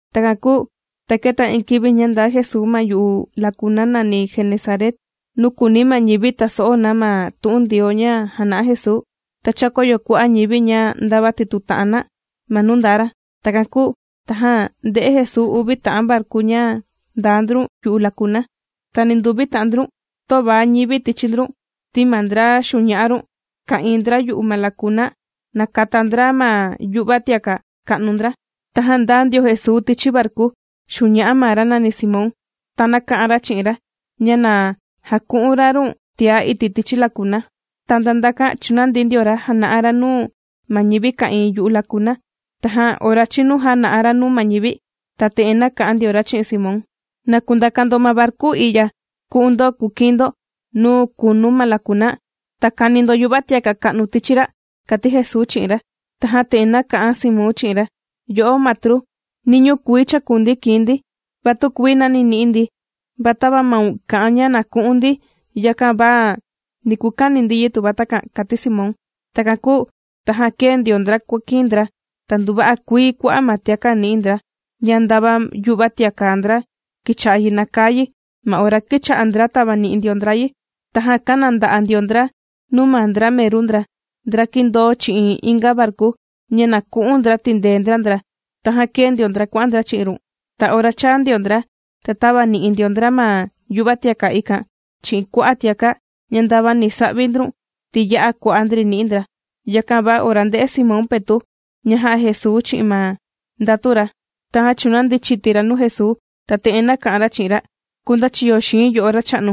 Takan kūu ta kēta iin kivi ña ndaa Jesuu ma yu'u lakuna nàni Genesaret, nuu kùuni ma ñivi taso'o na ma tu'un Ndioo ña jàna'a Jesuu. Ta chākoyo kua'a' ñivi ña ndava tituta'an na ma nuu ndaa ra. Takan kūu tajan ndē'e Jesuu uvi ta'an varku ña ndaa ndrun yu'u lakuna. Ta ninduvi ta'an ndrun töva ñivi tichi ndrun, ti ma ndra xuña'a run ka'ìin ndra yu'u ma lakuna nàkata ndra ma yu'va tiaka' ka'nu ndra. Tajan ndāa ndio Jesuu tichi varku xuña'a ma ra nàni Simón, ta nāka'an ra chi'in ra ña na jaku'un ra run tiá iti' tichi lakuna. Ta nda ndakan chūnandi ndio ra jàna'a ra nuu ma ñivi ka'ìin yu'u lakuna. Tajan ora chīnu jàna'a ra nuu ma ñivi, ta te'en nāka'an ndio ra chi'in Simón: ―Na kundaka ndo ma varku i'ya ku'un ndo kukiin ndo nuu kunu ma lakuna, ta kani ndo yu'va tiaka' ka'nu tichi ra' ―kàti Jesuu chi'in ra. Tajan te'en nāka'an Simón chi'in ra: ―Yo'o Matru, niñuu kuii chākunuu ndi kīin ndi, va tükuii nani nī'i ndi. Va tava maun kà'an ña na ku'un ndi, yakan va ni kukani ndi yi tuva takan ―kàti Simón. Takan kūu tajan kēe ndio ndra kuàkiin ndra, ta nduva'a kuii kua'a' ma tiaka' nī'i ndra ña nda ma yu'va tiaka' ndra kīcha'a yi nakaa yi ma ora kīcha'a ndra tàvani'i ndio ndra yi. Tajan kāna nda'a' ndio ndra nuu ma ndra meru ndra, ndra kìndoo chi'in inga varku, ña na ku'un ndra tìndee ndra ndra. Tajan kēe ndio ndra kuà'an ndra chi'in run. Ta ora chāa ndio ndra, ta tāvani'i ndio ndra ma yu'va tiaka' ikan chi'in kua'a' tiaka' ña ndava ni sa'vi ndrun, ti ya'a kua'a' ndri nī'i ndra. Yakan va ora ndē'e Simón Petu' ña jā'a Jesuu chi'in ma ndatu ra, tajan chūnandi chiti ra nuu Jesuu, ta te'en nāka'an ra chi'in ra: ―¡Kundachiyo xii̱n yo'o Racha'nu,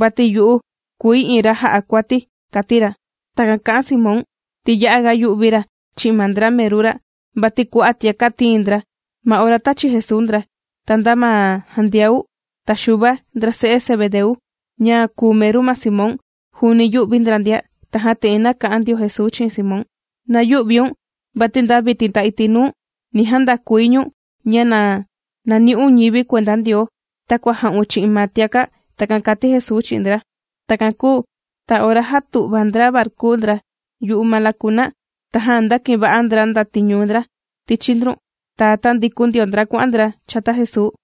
vati yu'u kùi iin ra jà'a kuati! ―kàti ra. Takan kā'an Simón, ti ya'aga yū'vi ra chi'in ma ndra meru ra, vati kua'a' tiaka' tīin ndra ma ora tāchi Jesuu ndra. Ta nda ma Jandiau, ta Xuva, ndra se'e Zebedeu, ña kùu meru ma Simón, juuni yū'vi ndra ndia. Tajan te'en nāka'an ndio Jesuu chi'in Simón: ―¡Na yü'viun! Vati nda vitin, ta iti' nuu, ni jandakui ñu̱n, ña na nani'un ñivi kuenda Ndioo, takua jā'un chi'in ma tiaka'. ―Takan kàti Jesuu chi'in ndra. Takan kūu ta ora jātu'va ndra varku ndra yu'u ma lakuna, tajan ndākiva'a ndra ndatiñu ndra tichi ndrun, ta tāndikun ndio ndra kuà'an ndra chata Jesuu.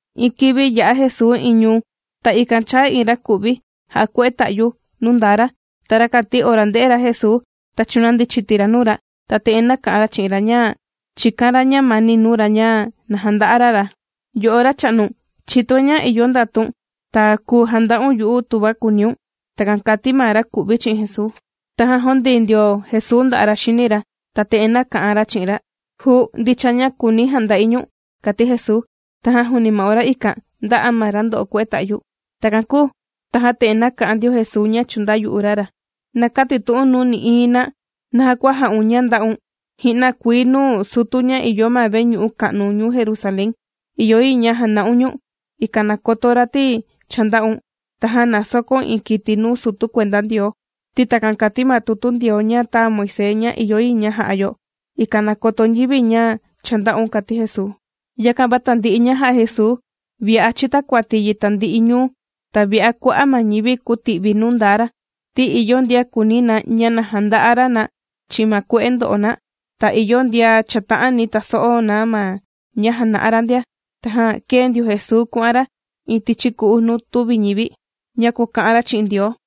Iin kivi yā'a Jesuu iin ñuu, ta ikan chāa iin raku'vi jà'a kue'e ta'yu nuu ndaa ra. Ta rakan ti ora ndē'e ra Jesuu, ta chūnandi chiti ra nuu ra, ta te'en nāka'an ra chi'in ra ña chīkan ra ñamani nuu ra ña na janda'a ra ra: ―¡Yo'o Racha'nu, chìtoi ña ìyo ndatun ta kùu janda'un yu'u tuva kùuniun! ―Takan kāti ma raku'vi chi'in Jesuu. Tajan jūndii ndio Jesuu nda'a' ra xini ra, ta te'en nāka'an ra chi'in ra: ―Juu, ndicha ña kùuni̱ janda'i ñu̱n ―kàti Jesuu. Tajan juuni ma ora ikan, ndā'a ma ra ndo'o kue'e ta'yu. Takan kūu tajan te'en nāka'an ndio Jesuu ña chūndayu'u ra ra: ―Na kätitu'un nuu nï'iin na naja kua jā'un ña ndā'un. Ji'na kuii nuu sutu ña ìyo ma veñu'u ka'nu ñuu Jerusalén, ìyo yi ña jana'un ñu̱n, ikan na koto ra ti cha ndā'un. Tajan na sokóun iin kiti nuu sutu kuenda Ndioo, ti takan kàti ma tutu Ndioo ña tāa Moisés ña ìyo yi ña ja'a yo, ikan na koto ñivi ña cha ndā'un ―kàti Jesuu. Yakan va tandi'i ña jà'a Jesuu, vi'a chītakuati yi tandi'i ñuu, ta vi'a kua'a' ma ñivi kūti'vi nuu ndaa ra, ti ìyo ndian kùuni na ña na janda'a ra na chi'in ma kue'e ndo'o na, ta ìyo ndian chàta'ani taso'o na ma ña jàna'a ra ndia. Tajan kēe ndio Jesuu kuà'an ra iin tichi ku'u nuu tüvi ñivi, ña kuàka'an ra chi'in Ndioo.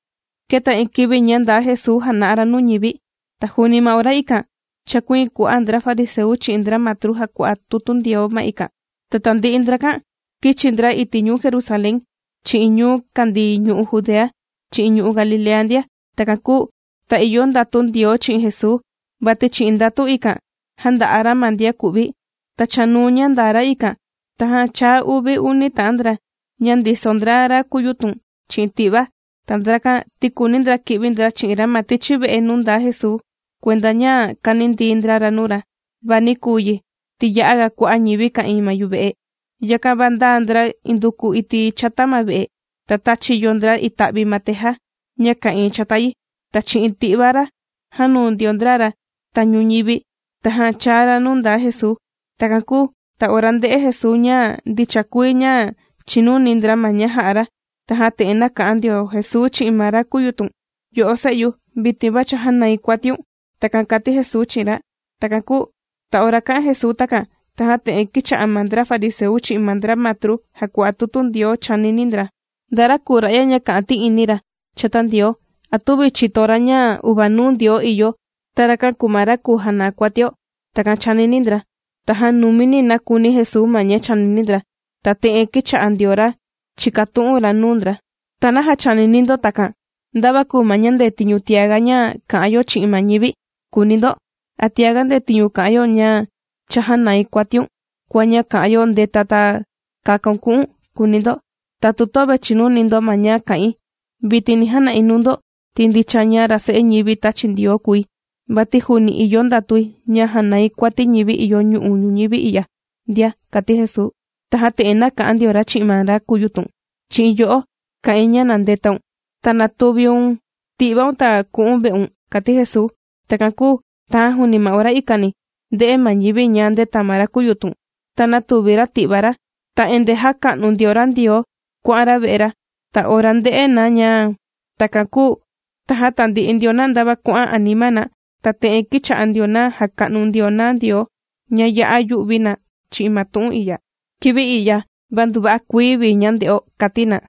Kēta iin kivi ña ndaa Jesuu jàna'a ra nuu ñivi. Ta juuni ma ora ikan chàkuiin kua'a' ndra fariseu chi'in ndra matru jàkua'a tutu Ndioo ma ikan. Ta tandi'i ndrakan kīchi ndra iti' ñuu Jerusalén chi'in ñuu kàndii ñu'u' Judea chi'in ñu'u' Galilea ndia. Takan kūu ta ìyo ndatu Ndioo chi'in Jesuu, vati chi'in ndatu ikan jànda'a ra ma ndian ku'vi. Ta chanuu ña ndaa ra ikan, tajan chāa uvi uni ta'an ndra ña ndiso ndra, ra kūyutun chi'in ti'va. Ta ndrakan ti kùuni ndra ki'vi ndra chi'in ra ma tichi ve'e nuu ndaa Jesuu, kuenda ña kanindii ndra ra nuu ra. Va nī kuu yi, ti ya'aga kua'a' ñivi ka'ìin ma yuve'e, yakan va ndāa ndra nduku iti' chata ma ve'e, ta tāchiyo ndra ita'vi ma teja ña ka'ìin chata yi, ta chi'in ti'va ra jānuu ndio ndra ra tañu ñivi, tajan chāa ra nuu ndaa Jesuu. Takan kūu ta ora ndē'e Jesuu ña ndicha kuii ña chìnuni ndra ma ña jà'a ra, tajan te'en nāka'an ndio Jesuu chi'in ma ra kūyutun: ―Yo'o se'yu, vitin va cha jānai kuatiun. ―Takan kàti Jesuu chi'in ra. Takan kūu ta ora kā'an Jesuu takan, tajan te'en kīcha'a ma ndra fariseu chi'in ma ndra matru jàkua'a tutu Ndioo chànini ndra: “¿Nda ra kùu ra'ya ña kà'an ti'ini ra chata Ndioo? ¿A tüvi chìto ra ña uvanuu Ndioo ìyo, ta rakan kùu ma ra kùu janaa kuatio?” Takan chànini ndra. Tajan numini nākuni Jesuu ma ña chànini ndra, ta te'en kīcha'a ndio ra chìkatu'un ra nuu ndra: ―¿Ta naja chànini ndo takan? ¿Nda va kùu ma ña ndetiñu tiaga ña ka'an yo chi'in ma ñivi?, kùuni ndo. ¿A tiaga ndetiñu kà'an yo ña: “Cha jānai kuatiun”, kua ña kà'an yo: “Ndeta, ta kakaun ku'un”?, kùuni ndo. Tatu töve chìnuni ndo ma ña kà'in, vitin ni jana'i nuu ndo ti ndicha ña ra Se'e ñivi tàchi Ndioo kùi, vati juuni ìyo ndatui ña jànai kuati ñivi ìyo ñu'u' ñuñivi i'ya ndia ―kàti Jesuu. Tajan te'en nāka'an ndio ra chi'in ma ra kūyutun: ―¡Chi'in yo'o kà'in ña na ndetaun, ta natuviun ti'vaun ta ku'u̱n ve'un! ―kàti Jesuu. Takan kūu tajan juuni ma ora ikani, ndē'e ma ñivi ña ndēta ma ra kūyutun, ta nātuvi ra ti'va ra, ta endee jàka'nu ndio ra Ndioo kuà'an ra ve'e ra. Ta ora ndē'e na ña takan kūu, tajan tandi'i ndio na ndava kuà'an anima na, ta te'en kīcha'a ndio na jàka'nu ndio na Ndioo ña yā'a yū'vi na chi'in ma tu'un i'ya: ―Kivi i'ya, va nduva'a kuii vii ña ndē'o ―kàti na.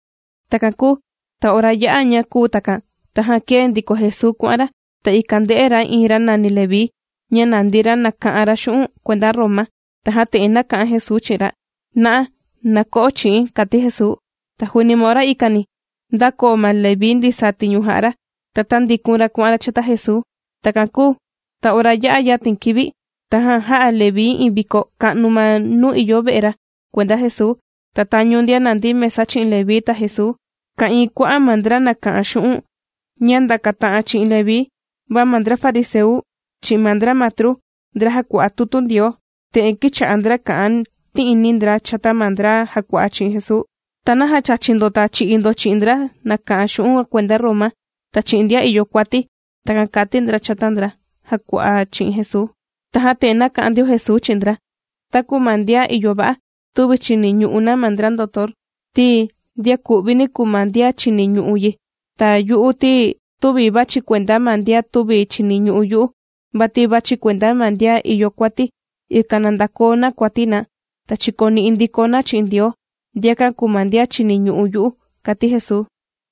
Takan kūu ta ora yā'a ña kūu takan, tajan kēe ndiko Jesuu kuà'an ra, ta ikan ndē'e ra iin ra nàni Leví ña nàndi ra nàka'an ra xu'un' kuenda Roma. Tajan te'en nāka'an Jesuu chi'in ra: ―¡Na'a, na ko'o chi'i̱n! ―kàti Jesuu. Ta juuni ma ora ikani, ndākoo ma Leví ndisaa tiñu jà'a ra, ta tāndikun ra kuà'an ra chata Jesuu. Takan kūu ta ora yā'a yatin kivi, tajan jā'a Leví iin viko ka'nu ma nuu ìyo ve'e ra kuenda Jesuu. Ta tañu ndian nàndi mesa chi'in Leví ta Jesuu, ka'ìin kua'a' ma ndra nàka'an xu'un' ña ndàkata'an chi'in Leví. Va ma ndra fariseu chi'in ma ndra matru, ndra jàkua'a tutu Ndioo, te'en kīcha'a ndra kà'an ti'ini ndra chata ma ndra jàkua'a chi'in Jesuu: ―¿Ta naja chàchi ndo ta chì'i ndo chi'in ndra nàka'an xu'un' kuenda ñuu ka'nu Roma, ta chi'in ndian ìyo kuati? ―Takan kàti ndra chata ndra jàkua'a chi'in Jesuu. Tajan te'en nāka'an ndio Jesuu chi'in ndra: ―Taku ma ndian ìyo va'a, tüvi chìniñu'u na ma ndra ndotor, ti ndian ku'vini kùu ma ndian chìniñu'u yi. Ta yu'u ti tüvi vàchi̱ kuenda ma ndian tüvi chìniñu'u yu'u, vati vàchi̱ kuenda ma ndian ìyo kuati, ikan na ndakoo na kuati na, ta chìkoni'i ndiko na chi'in Ndioo. Ndiakan kùu ma ndian chìniñu'u yu'u ―kàti Jesuu.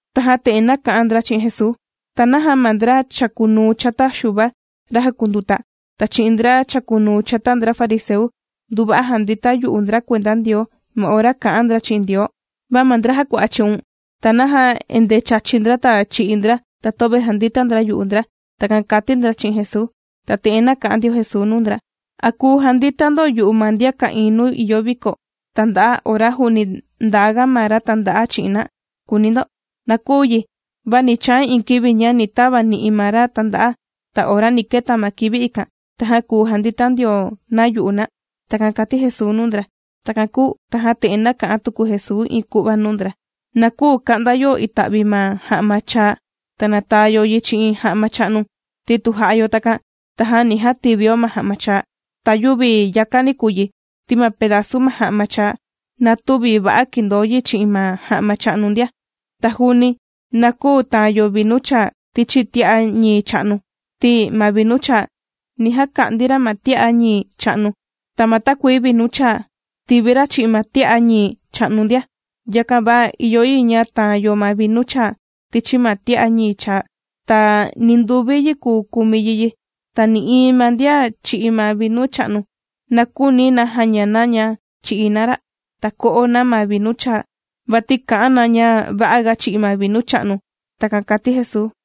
Tajan te'en nāka'an ndra chi'in Jesuu: ―¿Ta naja ma ndra chàkunuu chata Xuva ra jàkunduta, ta chi'in ndra chàkunuu chata ndra fariseu, nduva'a jàndita yu'u ndra kuenda Ndioo ma ora kà'an ndra chi'in Ndioo? Va ma ndra jàkua'a chi'un, ¿ta naja endee chàchi ndra, ta chì'i ndra, ta töve jàndita ndra yu'u ndra? ―Takan kàti ndra chi'in Jesuu. Ta te'en nāka'an ndio Jesuu nuu ndra: ―¿A kùu jandita ndo yu'u ma ndian ka'ìin nuu ìyo viko tànda'a ora juuni ndaaga ma ra tànda'a chi'in na?, kùuni ndo. Na küu yi. Va ni chaa iin kivi ña ni tava ni'i na ma ra tànda'a, ta ora ni keta ma kivi ikan, tajan kùu jandita ndio na yu'u na. ―Takan kàti Jesuu nuu ndra. Takan kūu tajan te'en nàka'an tuku Jesuu iin ku'va nuu ndra: ―Na küu ka'nda yo ita'vi ma ja'ma chaa, ta nataa yo yi chi'in ja'ma cha'nu, ti tu jà'a yo takan, tajan ni jativio ma ja'ma chaa. Ta yüvi yakani kùu yi, ti ma pedazu ma ja'ma chaa na tüvi va'a kìndoo yi chi'in ma ja'ma cha'nu ndia. Ta juuni na küu taan yo vinu chaa tichi tia'a ñii cha'nu, ti ma vinu chaa, ni jaka'ndi ra ma tia'a ñii cha'nu, ta ma takuii vinu chaa tìvi ra' chi'in ma tia'a ñii cha'nu ndia. Yakan va ìyo yi ña taan yo ma vinu chaa tichi ma tia'a ñii chaa, ta ninduvi yi kùu kumi yi yi. Ta nï'iin ma ndian chì'i ma vinu cha'nu, na küuni na jaña na ña chì'i na ra', ta ko'o na ma vinu chaa, vati kà'an na ña va'aga chì'i ma vinu cha'nu. ―Takan kàti Jesuu.